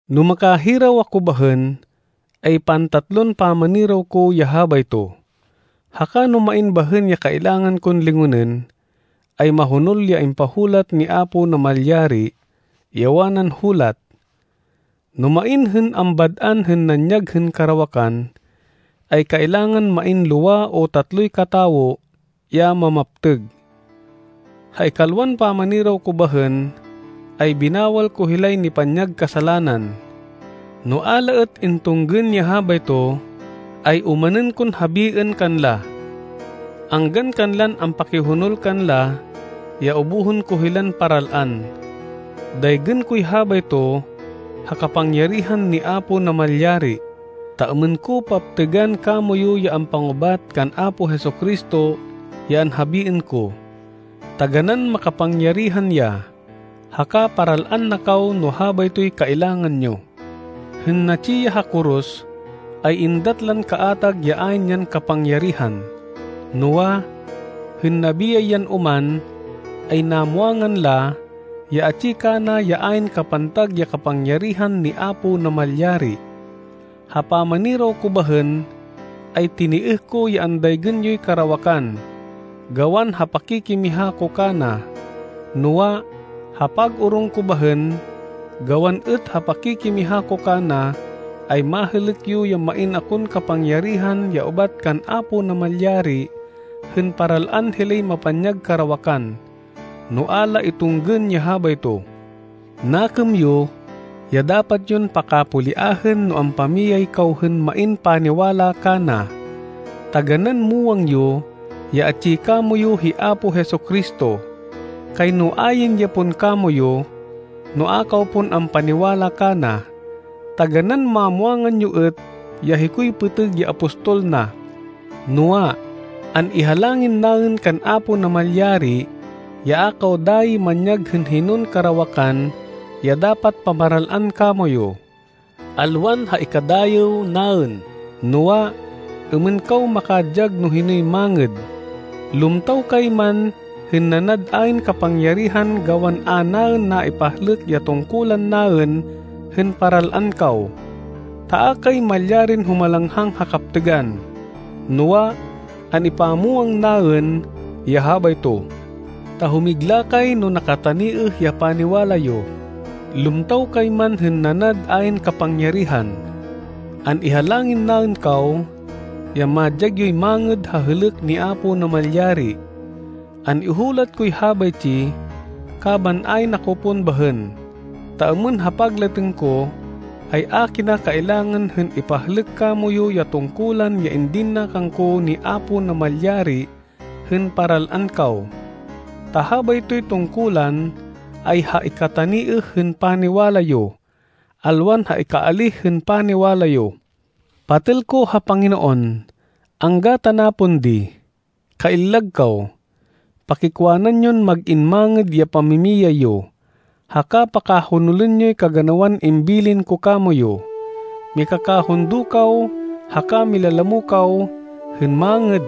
No makahiraw ako bahên, ay pantatlon pamaniraw ko ya habayto. Haka no main bahên ya kailangan kon lingonên, ay mahonol ya impahulat ni Apo Namalyari, ya wanan hulat, “No main hên ambad-an hên nanyag hên karawakan, ay kailangan main lowa o tatloy katawo ya mamaptêg.” Ha ikalwan pamaniraw ko bahên, ay binawal ko hilay nipanyag kasalanan. No a la êt intunggên ya habayto, ay omanên kon habiên kanla, anggan kanlan ampakihonol kanla ya ubuhên ko hilan paral-an. Daygên koy habayto ha kapangyarihan ni Apo Namalyari, ta êmên ko paptêgan kamoyu ya ampangubat kan Apo Jesu-Cristo ya anhabiên ko. Taganán makapangyarihan ya haka paral-an na kaw no habaytoy kailangan yo. Hên natsi ya ha koros, ay êndat lan kaatag ya ayn yan kapangyarihan, noa, hên nabiyay yan oman, ay namwangan la, ya atsi kana ya ayn kapantag ya kapangyarihan ni Apo Namalyari. Ha pamaniraw ko bahên, ay tinêêh ko ya andaygên yoy karawakan, gawan ha pakikimiha ko kana. Noa, ha pag-orong ko bahên, gawan êt ha pakikimiha ko kana, ay mahêlêk yo ya main akon kapangyarihan ya ubat kan Apo Namalyari hên paral-an hilay mapanyag karawakan, no a la itunggên ya habayto. Nakêm yo, ya dapat yon pakapoliahên no ampamiyay kaw hên main paniwala kana. Taganán muwang yo ya atsi kamoyu hi Apo Jesu-Cristo! Kayno ayn ya pon kamoyu, no a kaw pon ampaniwala kana. Taganán mamwangan yo êt ya hikoy pêtêg ya apostol na! Noa, an-ihalangin naên kan Apo Namalyari ya a kaw dayi manyag hên hinon karawakan ya dapat pamaral-an kamoyu, alwan ha ikadayêw naên, noa, êmên kaw makadyag no hinoy mangêd, lumtaw kay man hên nanad ayn kapangyarihan gawan a naên naipahlêk ya tungkulan naên hên paral-an kaw. Ta a kay malyarin humalanghang ha kaptêgan, noa, an-ipamwang naên ya habayto. Ta humigla kay no nakataniêh ya paniwala yo, lumtaw kay man hên nanad ayn kapangyarihan. An-ihalangin naên kaw, ya madyag yoy mangêd ha hêlêk ni Apo Namalyari. An-ihulat koy habaytsi kaban ayn ako pon bahên, ta êmên ha paglatêng ko, ay a kina kailangan hên ipahlêk kamoyu ya tungkulan ya indin na kangko ni Apo Namalyari hên paral-an kaw. Ta habaytoy tungkulan ay ha ikataniêh hên paniwala yo, alwan ha ikaalíh hên paniwala yo. Patêl ko ha Panginoon, angga tana pon di. Kaillag kaw. Pakikwanan yon mag-in mangêd ya pamimiyay yo, haka pakahonolên yoy kaganawan imbilin ko kamoyu. Mikakahundo kaw haka milalamo kaw hên mangêd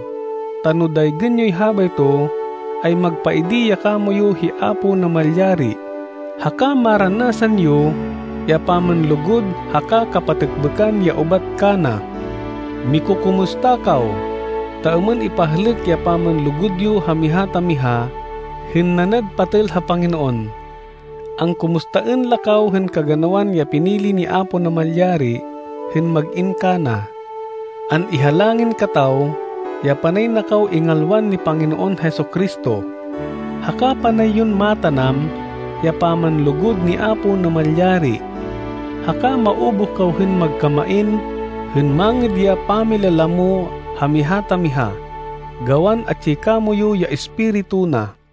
ta no daygên yoy habayto ay magpaidi ya kamoyu hi Apo Namalyari, haka maranasan yo ya pamanlugud haka kapatêkbêkan ya ubat kana. Mikukumusta kaw ta êmên ipahlêk ya pamanlugud yo ha miha ta miha hên nanad patêl ha Panginoon. Angkumustaên la kaw hên kaganawan ya pinili ni Apo Namalyari hên mag-in kana. An-ihalangin kataw ya panay na kaw ingalwan ni Panginoon Jesu-Cristo, haka panay yon matanam ya pamanlugud ni Apo Namalyari, haka maubuh kaw hên magkamain hên mangêd ya pamilalamo ha miha ta miha gawan atsi kamoyu ya Espiritu na.